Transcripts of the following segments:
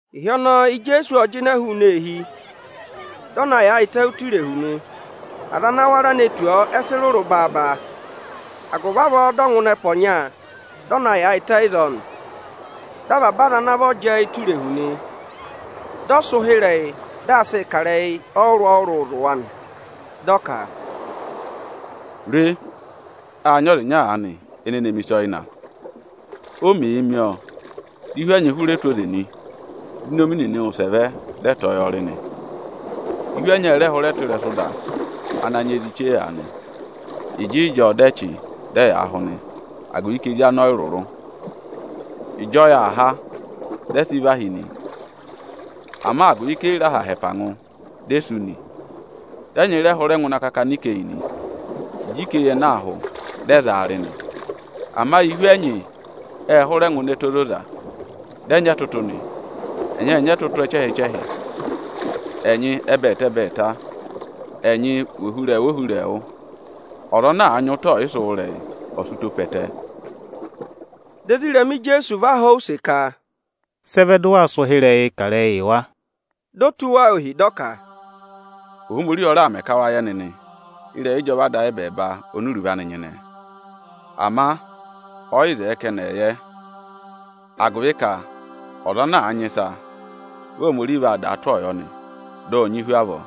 Ịhị ọnọọ Ijeesu ộ jịnẹ hụụnị eehi, dị ọ na yaayịtẹ ụtọ irehu nị. Aza ana wara ne tù ọ, ẹ sị rụrụ baaba; agụvị avọọ dị ọ ngụ ịnị ẹpa ọnya, dị ọ na yaayịtẹ ịzọọ nị. Dị avaba aza ana vọ jẹẹ ụtọ irehu nị. Dị ọ sị ụhịrẹyị, dị aa sịị kà ịrẹyị ọrụrụ-ọrụrụ zụ̀ wa nị. Dị ọ ka, “Re, â nyị ọza ịnya aanị ene ne mi ịsa ọyịna. O mèe mi ọ, dị ihu ẹnyị hụrẹ tụ́ oze nị, dị inomi nịnị wụsẹ vẹ dị ẹ tọ̀ọ́ yọọ rị nị. Ihu ẹnyị ẹ rẹ hụrẹ tụ́ ịrẹsụ ịda ana nyị ezi chee aanị. Ịjịịjọọ dị ẹ chị, dị ẹ yaa hụ nị, agụvị ka ezi anị ọ yị rụrụ. Ịjị ọyị aa há, dị ẹ sị vahi nị; ama agụvị ka e yi re aha ha ẹpa ngụ di e sú nị. Dị ẹnyị rẹ hụrẹ ne ngụ ịnị akakana ikeyi nị. Ịjị ikeyi ẹnẹẹ aa hụ, dị ẹ za wa rị nị. Ama ihu ẹnyị ẹ rẹ hụrẹ ne ngụ ịnị ẹtẹ ozoza, dị ẹ nyị ẹtụtụ nị; ẹnyị ệ nyị ẹtụtụ ẹchẹhị-ẹchẹhị, ẹnyị ẹbẹẹta-ẹbẹẹta, ẹnyị vị ohurẹẹwụ-ohurẹẹwụ. Ọza ana àa nyị ụtọ ọyịsị wụ́ ịrẹyị, ọ̀ sị ụtọ pe ẹtẹ!” Dị ezirẹma Ijeesu va họ̀ ọ use ka, “Sị ẹ vẹ dị ụ waa sị ụhịrẹyịị kà ịrẹyịị yị wa?” Di o tụ́ wa ohi, dị ọ ka, “Ohomorihi ọ raà mẹ ka wa yẹ nịnị ịrẹyị ịjọva Ada ayị ẹbẹẹba oni iruvo anị nyịnẹ. Ama ọza ẹ yị zẹẹ ka ẹnị ẹ̀ yẹ. Agụvị ka ọza ana àa nyị ịsa, vị Ohomorihi vaa dàa tụ́ ọọ yọ nị, dị ọ̀ nyị hu avọọ.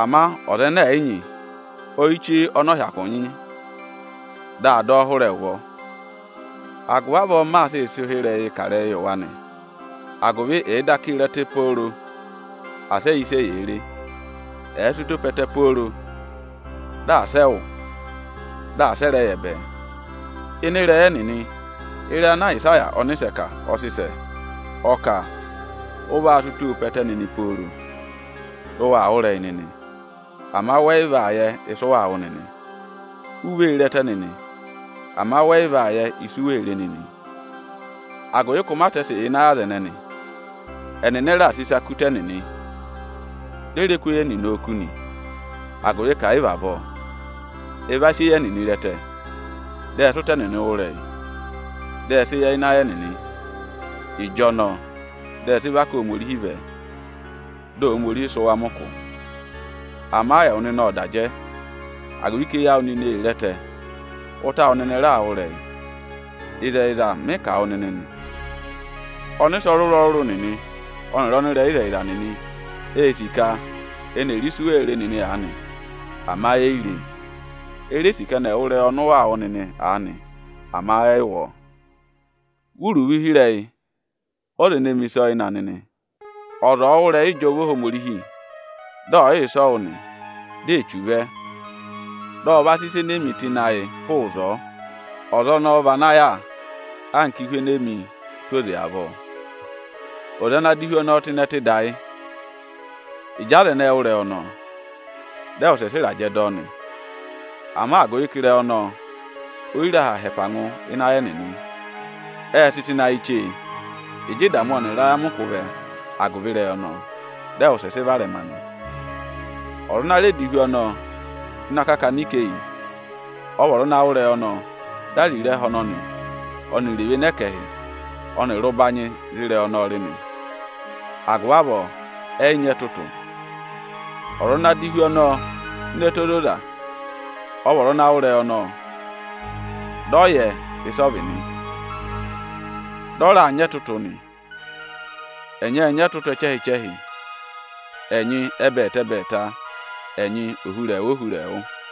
Ama ọza ẹnẹ ẹ̀ yị nyị, oyichee ọnị ọ̀ọ hyakụ nyị, di a dọ ọ hụrẹ ẹ ụvọ. Agụvị avọọ, m maa sịị sị ụhịrẹyịị kà ịrẹyịị yị wa nị; agụvị ẹ̀ẹ daka re ẹtẹ pooro, asị ẹ yẹ ịsị eyee re. Ẹ̀ẹ sị ụtọ pe ẹtẹ pooro, dị asị ẹ wụ́, dị asị ẹ rẹ yẹ bẹẹ. Ịnị ịrẹyị ẹnịnị, ịrẹyị ana Ayịsaya ọnịsẹ kà, ọ sị sẹ. Ọ kà, ‘Ụ vaa sị ụtọọ pe ẹtẹ nịnị pooro, dị ụ waa wụ́ ịrẹyị nịnị, ama wẹ yị vaa yẹ ịsị ụ waa wụ́ nịnị. U vee re ẹtẹ nịnị, ama wẹ yị vaa yẹ ịsị u wee re nịnị. Agụvị ka ụmatẹsị yà ịnị ayị aza ẹnẹnị. Ẹnịnị ẹ raà sị ịsa kú ụtọ ẹnịnị, di e re kú eyi ẹnịnị oku nị. Agụvị ka ẹ̀ yị vị avọọ, ẹ va sị eyi ẹnịnị re ẹtẹ, dị ẹ sị ụtọ ẹnịnị wụ́ ịrẹyị, dị ẹ sị yẹ ịnị ayị ẹnịnị, ịjọnọọ dị ẹ sị và ká Ohomorihi vẹ, dị Ohomorihi sị wa mẹ ụkụ.’ Ama ẹwụ nịnị ộ da jẹ, agụvị ka eyi awụ nịnị ee re ẹtẹ, ụtọ awụ nịnị raa wụ́ ịrẹyị. Ịzẹyịza mị kà wụ nịnị nị, ọnịsẹ ọrụrụ-ọrụrụ nịnị ọnịrị ọnịrẹyịzẹyịza nịnị ê sì ka eni è re ịsị u wee re nịnị aanị, ama eyi re e. E re sì ka ẹnị ẹ̀ wụ́ ịrẹyị ọnị ụ waa wụ́ nịnị aanị, ama ẹ yị wụ́ ọọ.” “Wụ́ iruvo ụhịrẹyị ọza ene mi ịsa ọyịna nịnị! Ọza ọ̀ọ wụ́ ịrẹyị ịjọva Ohomorihi dị ọ̀ yị yẹ ịsị ọ wụ́ nị, di Echu vẹ, dị ọ va sị ịsa enee mi tụ́ ịnị ayị hụụ ịzọọ. Ọza ọnọọ vị ana yà anka ihu enee mi tụ́ ụtọ oze avọọ. Ọza ana dọ ihu ọnọọ tụ́ ịnị ẹtẹ ịda yị: ịjị aza ẹnẹẹ wụ́ ịrẹyị ọnọọ, dị ẹ wụsẹ sị ịrajẹ dọ ọ nị. Ama agụvị ka ịrẹyị ọnọọ oyi re aha ha ẹpa ngụ ịnị ayị ẹnịnị, ệ sị tụ́ ịnị ayị chee. Ịjị ịdamụ ọnịrị ayamịkụ vẹ agụvị ịrẹyị ọnọọ, dị ẹ wụsẹ sị varẹma nị. Ọza ana rẹ dọ ihu ọnọọ tụ́ ịnị akakana ikeyi, ọ vị ọza ana wụ́ ịrẹyị ọnọọ di ariro ẹhẹ ọnọnị ọnịrị evene ẹkẹhị ọnịrị ụbanyị za ịrẹyị ọnọọ rị nị, agụvị avọọ ẹyị nyị ẹtụtụ. Ọza ana dọ ihu ọnọọ tụ́ ịnị ẹtẹ ozoza, ọ vị ọza ana wụ́ ịrẹyị ọnọọ, dị ọ yẹ ịsị ọ vị nị. Dị ọ raa nyị ẹtụtụ nị, ẹnyị ệ nyị ẹtụtụ ẹchẹhị-ẹchẹhị, ẹnyị ẹbẹẹta-ẹbẹẹta, ẹnyị ohurẹẹwụ-ohurẹẹwụ.”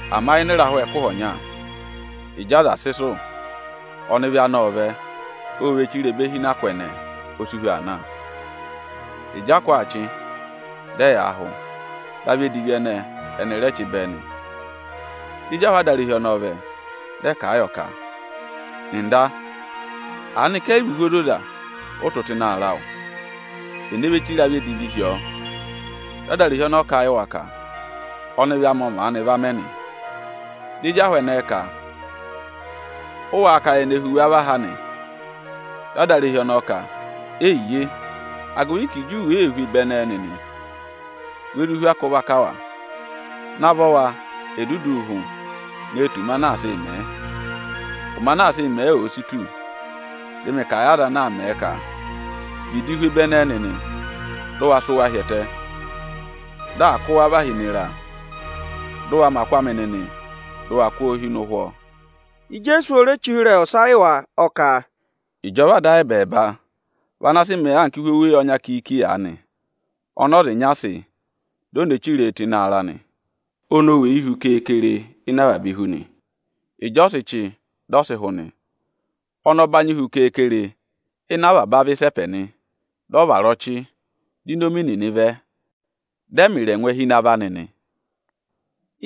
Ama ịnị ịrahụ ẹkụhị ọnya, ịjị aza sị sụ̀, ọnịvị anị ộ vẹ, o ve chire ebe hi ịnị akụ ẹnẹẹ, o si hu aa na. Ịjị akụ aa chị, dị ẹyaa hụ, dị avị edivi ẹnẹẹ ẹnị rẹ chị bẹẹ nị. Dị ezi ahụ adarehi ọnọọ vẹ, dị ẹ kà a yọ ka: ‘Ọga, aanị ka ẹ yị vị ihu ozoza ụ tụ́ ịnị aarẹ awụ? Ene ve chire avị edivi hi ọọ?’ Dị adarehi ọnọọ kà a yị wa ka: Ọnịvị anị ọ maanị va mẹ nị. Dị ezi ahụ ẹnẹẹ ka: ‘Ụ wáá ka ye ne hu wa và ha nị?’ Dị adarehi ọnọọ ka: ‘Eyiye,’ agụvị ka Ịjị u wèee hu ebe ẹnẹẹ nịnị, we zụ hu akụ vaka wa. Navọ wa, è duduu hụ ne tù ụmẹ anaa sịị̄ mẹ̀ ẹ! Ụmẹ anaa sịị̄ mẹ̀ ẹ òo si tù, dị mị kà a yị aza ana aa mẹ̀ ẹ ka: ‘Vịdị hu ebe ẹnẹẹ nịnị, dị ụ wa sụ́ wa hi ẹtẹ, dị à kụ́ wa na và hi ịnị ịra! Dị ụ wa mẹ akụ amị nịnị, dụ wa kụ́ ọ hi ịnị ụhwọ!’” Ijeesu o re che ụhịrẹyị ọsa yị wa, ọ ka, “Ịjọva Ada ayị ẹbẹẹba vị ana sị mẹẹ anka ihu oweyi ọnya kiiki aanị ọnị ọza ịnya sị, di o ne chiree tụ́ ịnị aarẹ anị. Ọnị ọ weyi hu keekere ịnị avaba ihu nị. Ịjị ọ̀ọ sị chị, dị ọ sị hụ nị, ọnị ọ banyị hu kere-kere ịnị avaba avị ịsẹpẹ nị. Dị ọ vara ọchị, di inomi nịnị vẹ, dị ẹ mẹ ịrẹngwẹ hi ịnị avọ anị.”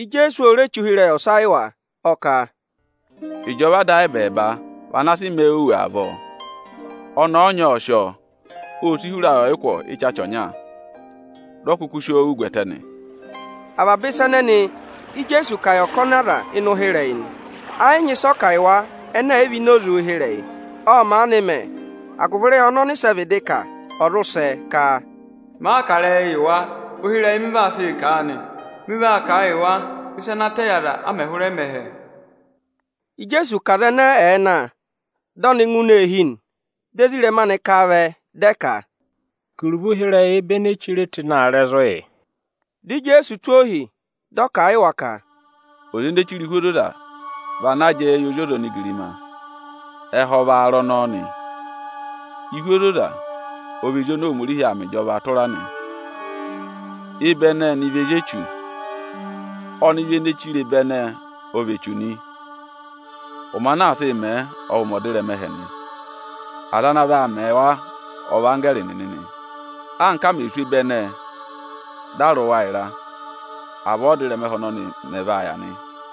Ijeesu o re che ụhịrẹyị ọsa yị wa, ọ ka, “Ịjọva Ada ayị ẹbẹẹba vị ana sị mẹẹ òwù avọọ. Ọnẹẹ ọnya ộ sị ọ, ô si hura ayị ọyịkwọ ịchacha ọnya, dị ọ kụkụ si oo wù gwẹtẹ nị.” Avaba ịsa ẹnẹnị Íjeesu kà yị ọkọnị aza ịnị ụhịrẹyị nị. Ẹ yị nyị ịsị ọ kà yị wa ẹnẹ ẹ̀ yị vị ịnị oze ụhịrẹyị. Ộ maanị mẹ, agụvị ịrẹyị ọnị ọnịsẹ vịdị kà, ọ̀ zụ sẹ ka, “Màa kà ịrẹyị yị wa, ụhịrẹyị mị vaa sị kà a nị. Mị vaa kà a yị wa ịsa ana tẹ yị aza, a mẹ̀ hụrẹ mẹ ẹhẹ.” Ijeesu ka aza ẹnẹẹ ẹ̀ẹ na, dị ọnị ngụ ini eehi nị. Dị ezirẹma anị ka a vẹ, dị ẹ ka, “Kà iruvo ụhịrẹyị ebe enee chire tụ́ ịnị aarẹ zụ̀ yị.” Dị Ijeesu tụ́ ohi, dị ọ kà a yị wa ka, “Ọza ene chire ihu ozoza vị ana jẹẹ yị Ozi ọza onigirima. Ẹhẹ ọ vị aarẹ ọnọọ nị. Ihu ozoza ọ vị ezi oni Ohomorihi aa mẹ ịjọva tụra nị. Ebe ẹnẹẹ ẹnị vị ezi Echu nị. Ọnịvị ọnọọ ene ne chire ebe ẹnẹẹ ọ vị echu nị. Ụmẹ anaa sịị̄ mẹẹ ọ vị ụmẹ ọdịrẹma ẹhẹ nị. Aza ana vaa mẹ wa ọ vị anggẹẹrị nịnị nị. Anka a mẹ̀ sụ́ ebe ẹnẹẹ, dị a rị wa ịra, avọọ ọ́dịrẹma ẹhẹ ọnọnị mẹ̀ vaa yà nị.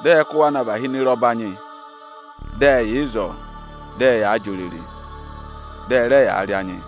Dị ẹ kụ́ wa na và hi ịnị ịra ọbanyị. Dị ẹ yà ịzọọ, dị ẹyaa jị òrèrè, dị ẹ rẹ yaa rị anyị.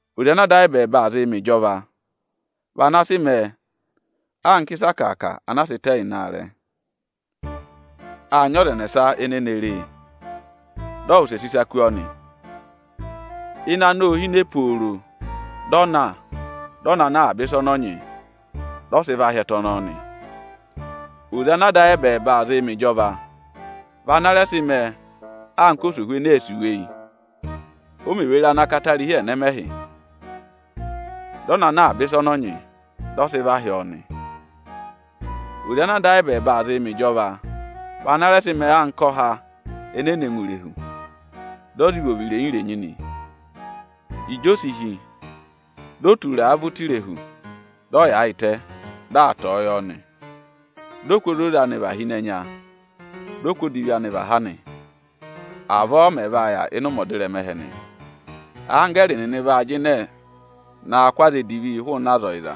“Oze ana Ada ayị ẹbẹẹba aa zịị mẹ ịjọva vị ana sị mẹẹ anka ịsa akàaka anaa sị tẹ ịnị aarẹ. Â nyị ọza ẹnẹsa ene ne re e, dị ọ wụsẹ sị ịsa kú ọ nị. Ịnẹ anị ô hine pooro, dị ọ na, dị ọ na ná avaba ịsa ọnọọ nyị, dị ọ sị va hị́ ẹtẹ ọnọọ nị.” “Oze ana ada ayị ẹbẹẹba aa zịị mẹ ịjọva vị ana rẹ sị mẹẹ anka osohu ene ee sì uweyi. O mè ve re ana katarihi ẹnẹmẹhị, dị ọ na ná avaba ịsa ọnị ọ nyị, dị ọ sị va hị́ ọ nị.” “Oze ana Ada ayị ẹbẹẹba aa zị mẹ ịjọva vị ana rẹ sị mẹẹ anka ọha enee ne ngụ ini irehu, dị ọ za ivovo irenyi-irenyi avọọ. Ịjị o si hí, di o tura a vẹ ụtọ irehu, dị ọ yaayịtẹ, dị aa tọ̀ọ́ yọ nị. Dị ọ kụ́ ozoza anị và hi ịnị ẹnya, dị ọ kụ́ odivi anị và ha nị. Avọọ ọ mẹ̀ vaa yà ịnị ụmẹ ọdịrẹma ẹhẹ nị: Anggẹẹrị nịnị vaa jịnẹ naa kụ́ aza edivi hụụnị aza ọyịza,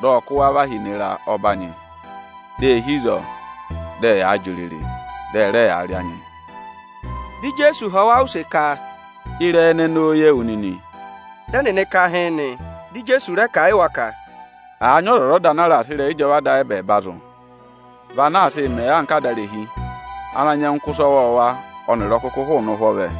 dị ọ kụ́ wa và hi ịnị ịra ọbanyị. Dị e hi ịzọọ, dị ẹyaa jị òrèrè, dị ẹ rẹ yaa rị anyị.” Dị Ijeesu họ̀ wa use ka, “Ịrẹyị ẹnẹnị ô ye wu nịnị?” Dị ẹnịnị ka hịịn nị. Dị Ijeesu rẹ kà a yị wa ka, “Avaba ọzwọzọda ana àa raà sị ịrẹyị ịjọva Ada ayị ẹbẹẹba zụ̀, vị ana sị mẹẹ anka adarehi ana nyẹngụ kụ́ ịsa ọwọọwa ọnịrị ọkụkụ hụụnị ụhwọ anị vẹ.”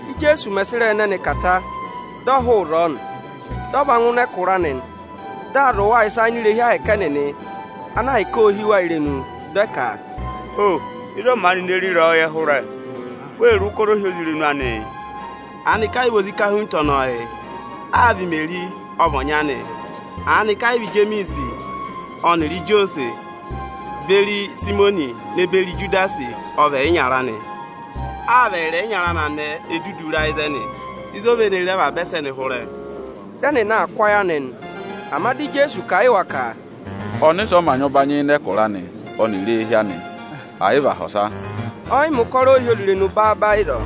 Íjeesu mẹ̀ sị ịrẹyị ẹnẹnị kà ta, dị ọ hụụ ịzọọ nị. Dị ọ va ngụ ịnị ẹkụra anị, dị aa zụ̀ wa ịsa ini irehi ahẹkẹ Aniju ẹnịnị, ana ahịka ô hí wa irenu. Dị ẹ ka, “Ho! Ịzị ọ maanị ne re ịrẹyọyẹ hụrẹ? Wee re ụkọrọ ohyozirenu anị? Aanị ka ẹ yị vị ozi ikahunta ọnọọ yị? Áa vị Imeri ọ vị ọnyị anị? Aanị ka ẹ yị vị Ijemiisi ọnịrị Ijosẹẹhụ beri Ịsayịmọnị ne beri Ijudasi ọ vị ẹyịnyara anị? Aa vị ẹyịrị ẹyịnyara anị anẹẹ e dudu ra ịzẹnị? Ịzị o ve ne re avaba ẹsẹnị hụrẹ?” Dị ẹnịnị aa kụ́ ayị anị nị. Ama dị Ijeesu kà a yị wa ka, “Ọnịsẹ ọ mā nyị ụbanyị ịnị ẹkụra anị ọnịrị éehi anị, ẹ̀ yị vị aha ọsa.” Ọ yị mẹ̀ ụkọrọ ohyozirenu baaba ịzọọ,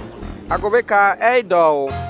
agụvị ka ẹnịnị ẹ yị dọ ọ wụ́.